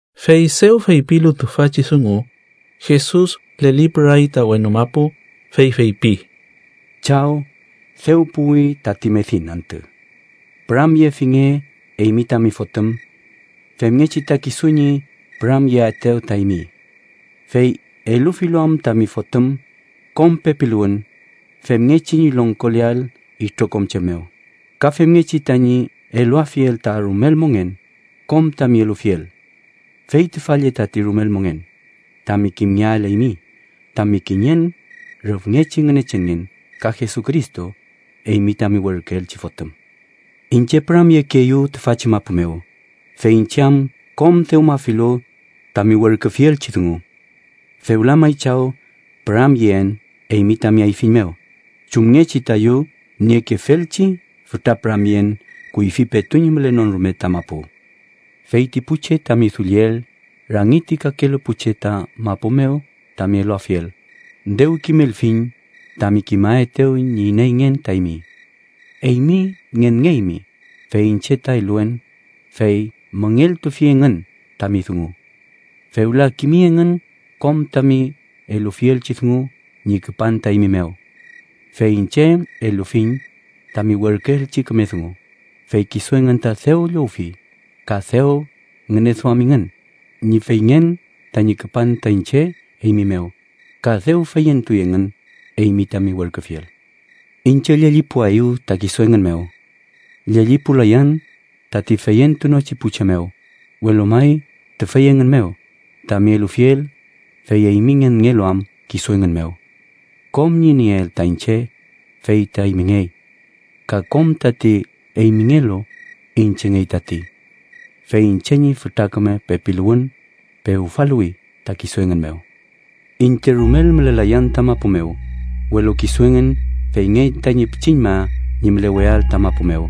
Fey dew feypilu tüfachi dungu, Jesus lelipüray ta wenu mapu, fey feypi: “Chaw, dew puwi tati medin antü. Püramyefinge eymi tami Fotüm, femngechi ta kisu ñi püramyeaetew ta eymi. Fey elufilu am tami Fotüm kom pepiluwün femngechi ñi longkoleael itrokom che mew, ka femngechi tañi eluafiel ta rumel mongen kom tami elufiel. Fey tüfa lle tati rumel mongen: tami kimngeael eymi, tami kiñen rüfngechi Ngünechenngen ka Jesucristo, eymi tami werküelchi Fotüm. “Iñche püramyekeeyu tüfachi mapu mew, fey iñche am kom dewmafilu tami werküfielchi dungu. Fewla may, Chaw püramyeen eymi tami ayfiñ mew chumngechi tayu niekefelchi fütra püramyen kuyfi petu ñi mülenon rume ta mapu. “Fey ti pu che tami dulliel rangi ti kakelu pu che ta mapu mew tami eluafiel, dew kimelfiñ tami kimaetew ñi ineyngen ta eymi. Eymi ngenngeymi, fey iñche ta eluen, fey müngeltufi engün tami dungu. Fewla kimi engün kom tami elufielchi dungu ñi küpan ta eymi mew. Fey iñche elufiñ tami werküelchi küme dungu, fey kisu engün ta dew llowfi, ka dew ngüneduamingün ñi feyngen tañi küpan ta iñche eymi mew, ka dew feyentuy engün eymi tami werküfiel. “Iñche llellipuaeyu ta kisu engün mew. Llellipulayan tati feyentunochi pu che mew, welu may tüfey engün mew tami elufiel, fey eymi ngenngelu am kisu engün mew. Kom ñi nieel ta iñche, fey ta eymingey. Ka kom tati eymingelu, iñchengey tati. Fey iñche ñi fütra küme pepiluwün pewfaluwi ta kisu engün mew. “Iñche rumel mülelayan ta mapu mew, welu kisu engün feyngey tañi pichiñma ñi müleweael ta mapu mew,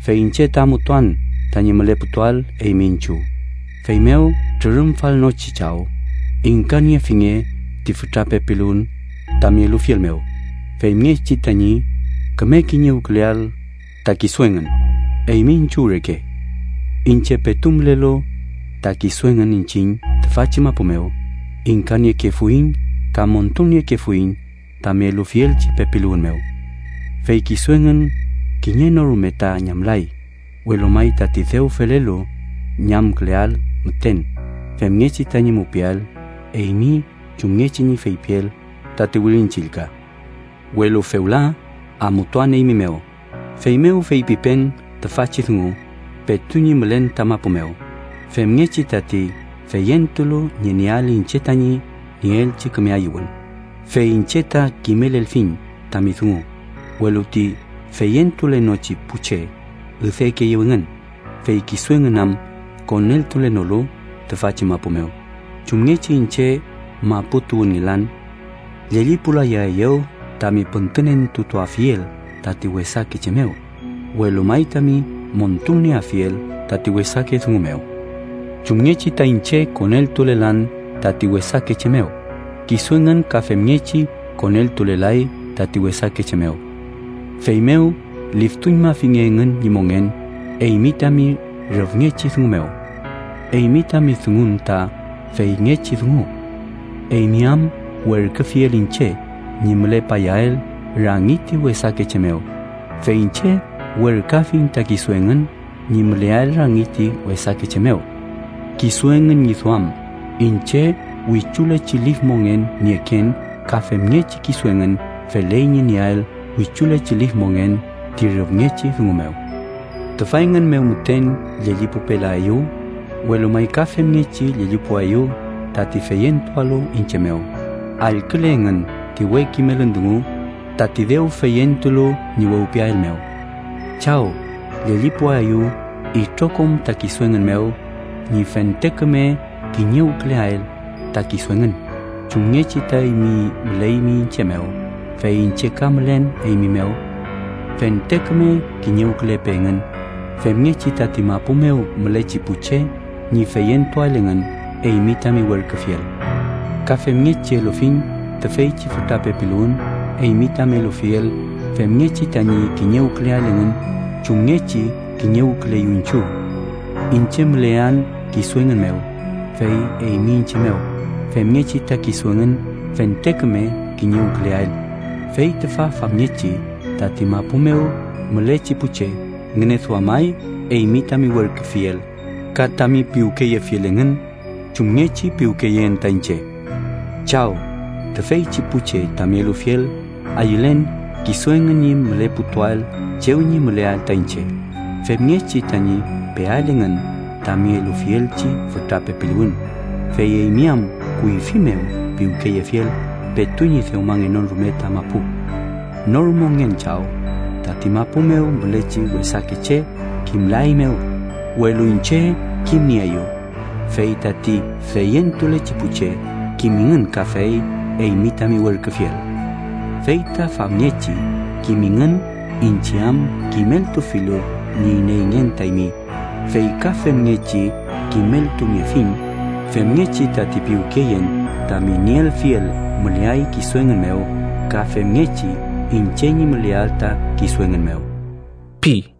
fey iñche ta amutuan tañi müleputuael eymi iñchiw. Feymew Trürümfalnochi Chaw, ingkaniefinge ti fütra pepiluwün tami elufiel mew, femngechi tañi küme kiñewküleael ta kisu engün, eymi iñchiw reke. Iñche petu mülelu ta kisu engün iñchiñ tüfachi mapu mew, ingkaniekefuiñ ka montulniekefuiñ tami elufielchi pepiluwün mew. Fey kisu engün kiñe no rume ta ñamlay, welu may tati dew felelu ñi ñamküleael müten, femngechi tañi mupiael eymi chumngechi ñi feypiel tati Wirin Chillka. “Welu fewla amutuan eymi mew, feymew feypipen tüfachi dungu petu ñi mülen ta mapu mew, femngechi tati feyentulu ñi nieael iñche tañi nieelchi küme ayüwün. Fey iñche ta kimelelfiñ tami dungu, welu ti feyentulenochi pu che üdekeeyew engün, fey kisu engün am koneltulenolu tüfachi mapu mew, chumngechi iñche mapu tuwünngelan. Llellipulayaeyu tami püntünentutuafiel tati wesake che mew, welu may tami montulnieafiel tati wesake dungu mew. Chumngechi ta iñche koneltulelan tati wesake che mew, kisu engün ka femngechi koneltulelay tati wesake che mew. Feymew liftuñmafinge engün ñi mongen eymi tami rüfngechi dungu mew. Eymi tami dungun ta feyngechi dungu. Eymi am werküfiel iñche ñi mülepayael rangi ti wesake che mew, fey iñche werküafiñ ta kisu engün ñi müleael rangi ti wesake che mew. Kisu engün ñi duam iñche wichulechi lif mongen nieken ka femngechi kisu engün feley ñi nieael wichulechi lif mongen ti rüfngechi dungu mew. “Tüfa engün mew müten llellipupelaeyu, welu may ka femngechi llellipuaeyu tati feyentualu iñche mew, allküle engün ti we kimelün dungu tati dew feyentulu ñi wewpiael mew. Chaw, llellipuaeyu itrokom ta kisu engün mew ñi fente küme kiñewküleael ta kisu engün, chumngechi ta eymi müleymi iñche mew, fey iñche ka mülen eymi mew. Fente küme kiñewkülepe engün, femngechi tati mapu mew mülechi pu che ñi feyentuael engün eymi tami werküfiel. Ka femngechi elufiñ tüfeychi fütra pepiluwün eymi tami elufiel, femngechi tañi kiñewküleael engün chumngechi kiñewküleyu iñchiw. Iñche mülean kisu engün mew, fey eymi iñche mew, femngechi ta kisu engün fente küme kiñewküleael, fey tüfa famngechi tati mapu mew mülechi pu che ngüneduamay eymi tami werküfiel, ka tami piwkeyefiel engün chumngechi piwkeyeen ta iñche. “Chaw, tüfeychi pu che tami elufiel ayülen kisu engün ñi müleputuael chew ñi müleael ta iñche, femngechi tañi peael engün tami elufielchi fütra pepiluwün, fey eymi am kuyfi mew piwkeyefiel petu ñi dewmangenon rume ta mapu. “Nor mongen Chaw, tati mapu mew mülechi wesake che kimlaeymew, welu iñche kimnieeyu, fey tati feyentulechi pu che kimingün kafey eymi tami werküfiel. Fey ta famngechi kimingün iñche am kimeltufilu ñi ineyngen ta eymi, fey ka femngechi kimeltuniefiñ femngechi tati piwkeyen tami nielfiel müleay kisu engün mew ka femngechi iñche ñi müleael ta kisu engün mew” pi.